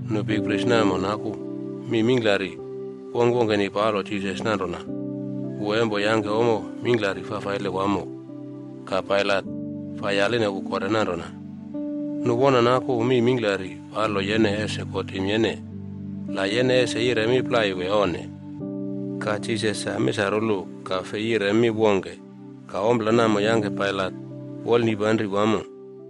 Nu bikpris namo naku mi mingklari wongkwongkeni palo Jisas nanrona wu empo yangke ommo mingklari fafaile wamo. Ka Pailat fai yaline wu kore nanrona, “Nu wona naku mi mingklari palo yene ese kotim yene, la yene ese yire mi plai wee onne?” Ka Jisas sa misarulu ka fei yire mi wongke. Ka ompla namo yangke Pailat wolnipanri wamo.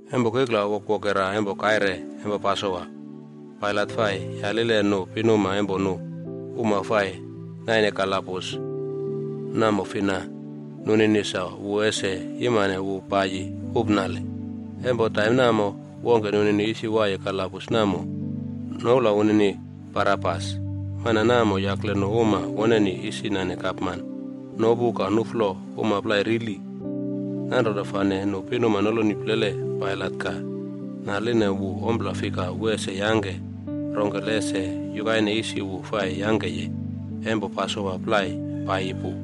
Empo kikla wokwokera empo kaire empo Pasowa, Pailat fai yalile nu pinuma empo nu uma fai naine kalabus namo fina nunini sa wu ese yimane wu paiyi upnale. Empo taim namo, wongke nunini isi waiye kalabus namo, noula wunini Barabas. Mana namo yakle nu uma woneni isi nane gapman nopu ka nuflo uma plai rili. Nanrona fane nu pinuma noloni plele Pailat ka naline wu ompla fika wu ese yangke rongkele ese yukaine isi wu fai yangkeye empo Pasowa plai paiyi pu.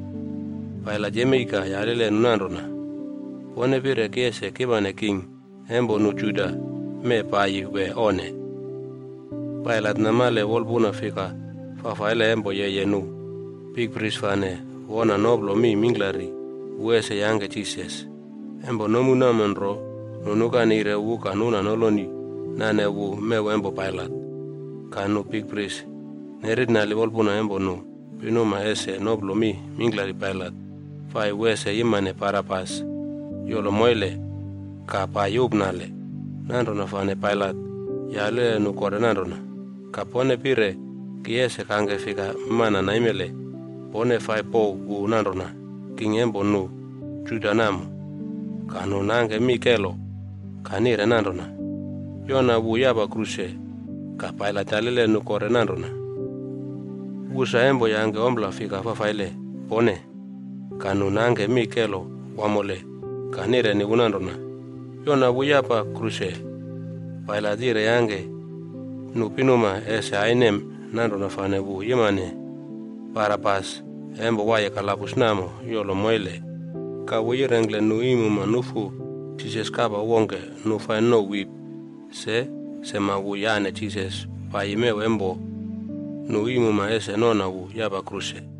Pailat yemei ka yalile nu nanrona, “Pone pire ki ese kimane king empo nu Juda mee paiyi wee onne?” Pailat namale wolpuna fika fafaile empo yeye nu bikpris fane wona noplo mi mingklari wu ese yangke Jisas. Empo nomu namo nro, nu nuka neire wu ka nuna noloni nane wu mew empo Pailat. Ka nu bikpris nerernali wolpuna empo nu pinuma ese noplo mi mingklari Pailat fai wu ese yimane Barabas yolo moile ka paiyi upnale. Nanrona fane Pailat yalile nu kore nanrona, “Ka pone pire ki ese kangke fika mana naimele pone fai pouw wu nanrona, ‘king empo nu Juda’ namo?” Ka nu nangke mi kelo ka nire nanrona, “Yona wu yapa kruse.” Ka Pailat yalile nu kore nanrona, “Wu sa empo yangke ompla fika fafaile pone?” Ka nu nangke mi kelo wamole ka nireni wu nanrona, “Yona wu yapa kruse.” Pailat yire yangke nu pinuma ese ainem, nanrona fane wu yimane Barabas empo waiye kalabus namo yolo moile. Ka wu yirengkle nu iimuma nufu Jisas kapa wongke nu fai nouw wip.a Se sema wu yane Jisas paiyi mew empo nu iimuma ese nona wu yapa kruse.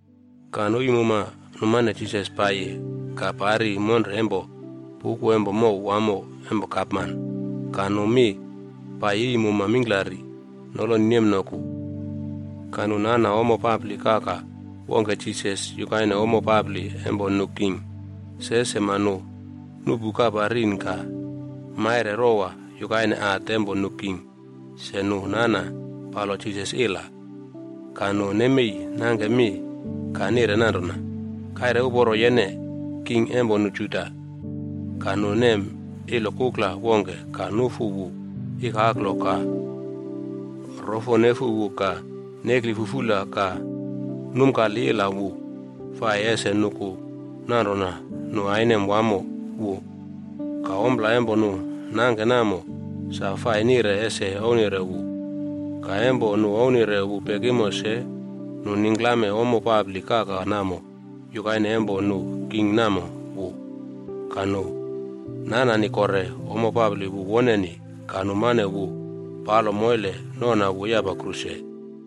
Ka nu iimuma numane Jisas paiyi ka pari monre empo puꞌku empo mow wamo empo gapman ka nu mi paiyi iimuma mingklari noloni nemnoku. Ka nu nana ommo papli kaka wongke Jisas yukaine ommo papli empo nu king. Se sema nu nuꞌpu kapa rin ka maire rowa yukaine hat empo nu king se nu nana palo Jisas ila. Ka nu nemei nangke mi ka nire nanrona, “Kaire uporo yene, king empo nu Juda!” Ka nu nem ilo kukla wongke ka nufu wu ikaklo ka rofo nefu wu ka nekli fufula ka numkali ila wu fai ese nuku nanrona nu ainem wamo wu. Ka ompla empo nu nangke namo, sa fai nire ese ouwnire wu. Ka empo nu ouwnire wu pekimo se, nu ningklame ommo papli kaka namo yukaine empo nu king namo wu. Ka nu nanani kore ommo papli wu woneni ka numane wu palo moile nona wu yapa kruse.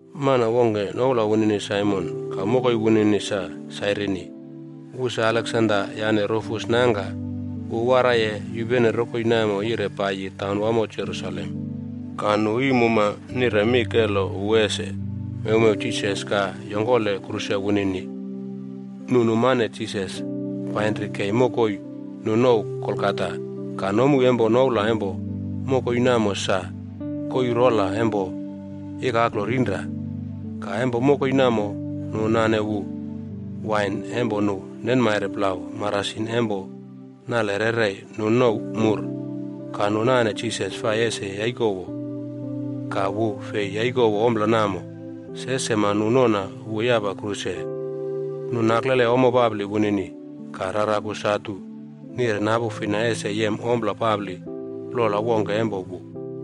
Mana wongke noula wunini Saimon ka mokoi wunini sa Sairini. Wu sa Aleksanda yane Rufus nangka. Wu waraiye yupene rokoi namo yire paiyi taunwamo Jerusalem. Ka nu iimuma nire mi kelo wu ese mewmew Jisas ka yongkole kruse wunini. Nu numane Jisas painri kei mokoi nu nouw Golgata. Ka nomu empo noula empo mokoi namo sa: “Koii rola empo ikaklo rinra.” Ka empo mokoi namo, nu nane wu wain empo nu nenmaire plau marasin empo nale rerei nu nouw “mur” ka nu nane Jisas fai ese yaikowo. Ka wu fei yaikowo ompla namo. Se sema nu nona wu yapa kruse. Nu naklele ommo papli wunini ka raraku satu nire napu fina ese yem ommo papli plola wongke empo wu.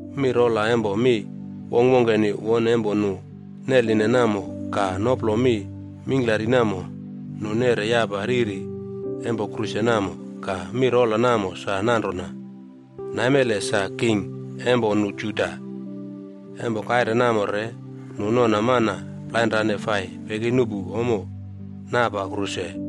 Mi rola empo mi wongkwongkeni won empo nu neline namo ka noplo mi mingklari namo, nu neꞌre yapa riri empo kruse namo. Ka mi rola namo sa nanrona: “NAIMELE SA KING EMPO NU JUDA.” Empo kaire namo re nu nona mana plainrane fai pekinuꞌpu ommo napa kruse.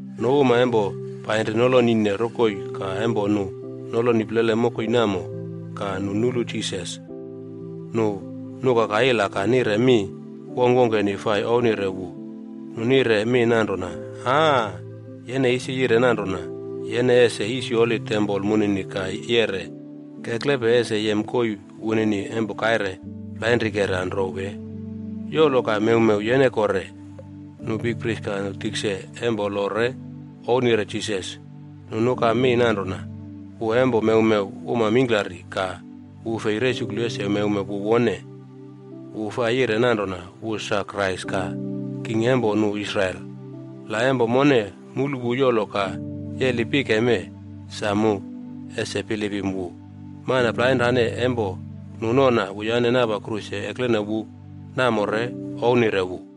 Nu uma empo painri nolonine rokoi ka empo nu noloni plele mokoi namo ka nu nulu Jisas, nu nukaka ila ka nire mi wongkwongkeni fai ouwnire wu. Nu nire mi nanrona, “Aaa, yene isi yire nanrona yene ese yisyoli tempol munini ka yere keklepe ese yem koii wunini empo kaire plainrikera nro wee! Yolo ka mewmew yene kore.” Nu bikpris ka nu tikse empo lo re ouwnire Jisas. Nu nuka mi nanrona, “Wu empo mewmew uma mingklari, ka wu fei resuklu ese mewmew wu wone! Wu fai yire nanrona wu sa Krais ka king empo nu Israel. La, empo mone mulu wu yolo ka yeli pike mee, sa mu ese bilipim wu.” Mana plainrane empo nu nona wuyane napa kruse eklene wu namo re ouwnire wu.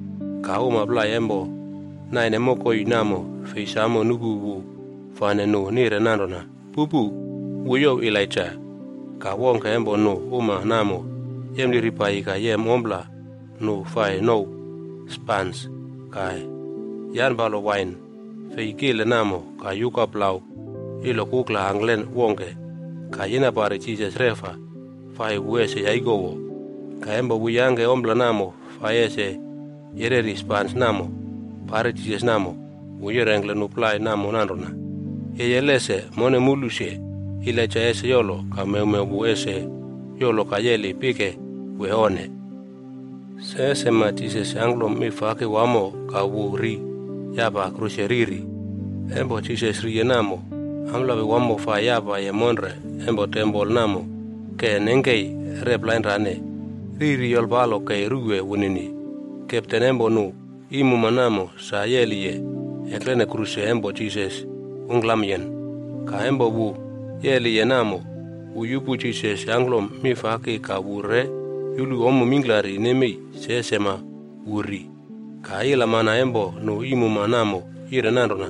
Ka uma plai empo naine mokoi namo fei samo nupu wu fane nu nire nanrona, “Pupu, wu youw Elaija.” Ka wongke empo nu uma namo yempliri paiyi ka yem ompla nu fai nouw “spans” ka yanpalo wain fei kile namo ka yuka plau ilo kukla angklen wongke ka yina pari Jisas reꞌfa fai wu ese yaikowo. Ka empo wu yangke ompla namo fai ese yereri spans namo pari Jisas namo, wu yirengkle nu plai namo nanrona, “Yeye lese mone mulu se, Elaija ese yolo ka mewmew wu ese yolo ka yeli pike wee onne?” Se sema Jisas yangklom mi faki wamo ka wu ri yapa kruse riri. Empo Jisas riye namo, amplapi wamo fai yapaye monre empo tempol namo ke nengkei rep plainrane, riri yolpalo kei ruwe wunini. Kepten empo nu iimuma namo sa yeli eklene kruse empo Jisas ungklamyen. Ka empo wu yeliye namo, wu yupu Jisas yangklom mi faki ka wu re yulu ommo mingklari nemei se sema wu ri. Ka ilamana empo nu iimuma namo yire nanrona,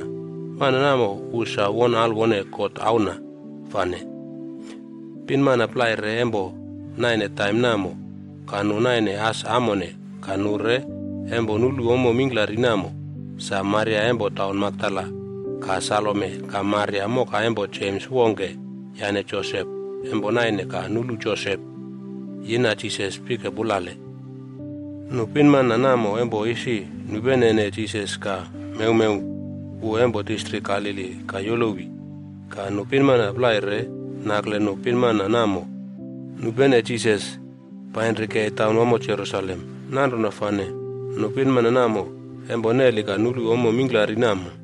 “Mana namo wu sa won alwone God Auna fane.” Pinmana plai re empo naine taim namo. Ka nu naine as amone ka nu re empo nulu ommo mingklari namo. Sa Maria empo taun Makdala ka Salome ka Maria moka empo Jems wongke yane Josep empo naine ka nulu Josep yina Jisas pike pulale. Nu pinmana namo empo isi nupene Jisas ka mewmew wu empo distrik Galili ka yolowi. Ka nu pinmana plai re nakle nu pinmana namo nupene Jisas painri kei taunwamo Jerusalem. Nanrona fane nu pinmana namo empo neli ka nulu ommo mingklari namo.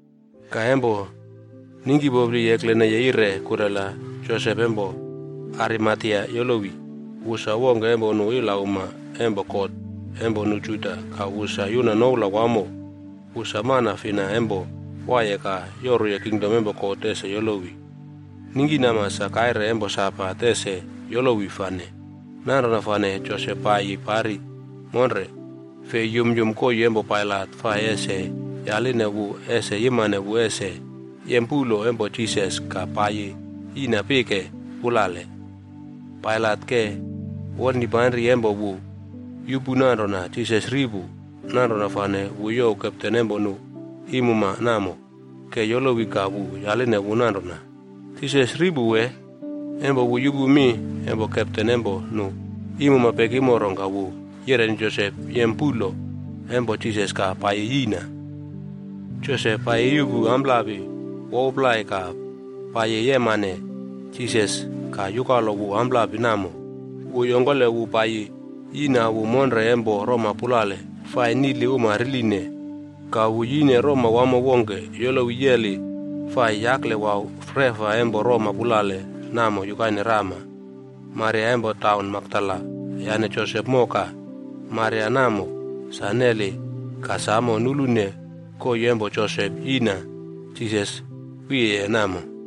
Ka empo ningkipopli ekleneye yire kurela, Josep empo Arimatea yolowi. Wu sa wongke empo nu ilauma empo kot empo nu Juda ka wu sa yuna noula wamo. Wu sa mana fina empo waiye ka yoruye kingdom empo God ese yolowi. Ningkinama sa kaire empo Sabat ese yolowi fane. Nanrona fane Josep pai pari monre fei yumyum koii empo Pailat fai ese yaline wu ese yimane wu ese yem puꞌlo empo Jisas ka paiyi yiꞌna pike pulale. Pailat ke wolnipanri empo wu yupu nanrona Jisas ri pu. Nanrona fane wu youw kepten empo nu iimuma namo ke yolowi ka wu yaline wu nanrona, “Jisas ri pu wee?” Empo wu yupu mi empo kepten empo nu iimuma pekimo rongka wu yireni Josep yem puꞌlo empo Jisas ka paiyi yiꞌna. Josep paiyi yuꞌpu amplapi wouw plai ka paiyi yemane Jisas ka yukalo wu amplapi namo. Wu yongkole wu paiyi yina wu monre empo roma pulale nu fai niꞌli uma riline. Ka wu yine roma wamo wongke yolowi yeli fai yaklewau reꞌfa empo roma pulale namo yukaine rama. Maria empo taun Makdala yane Josep moka Maria namo sa neli ka samo nulune koii empo Josep yina Jisas wiyeye namo.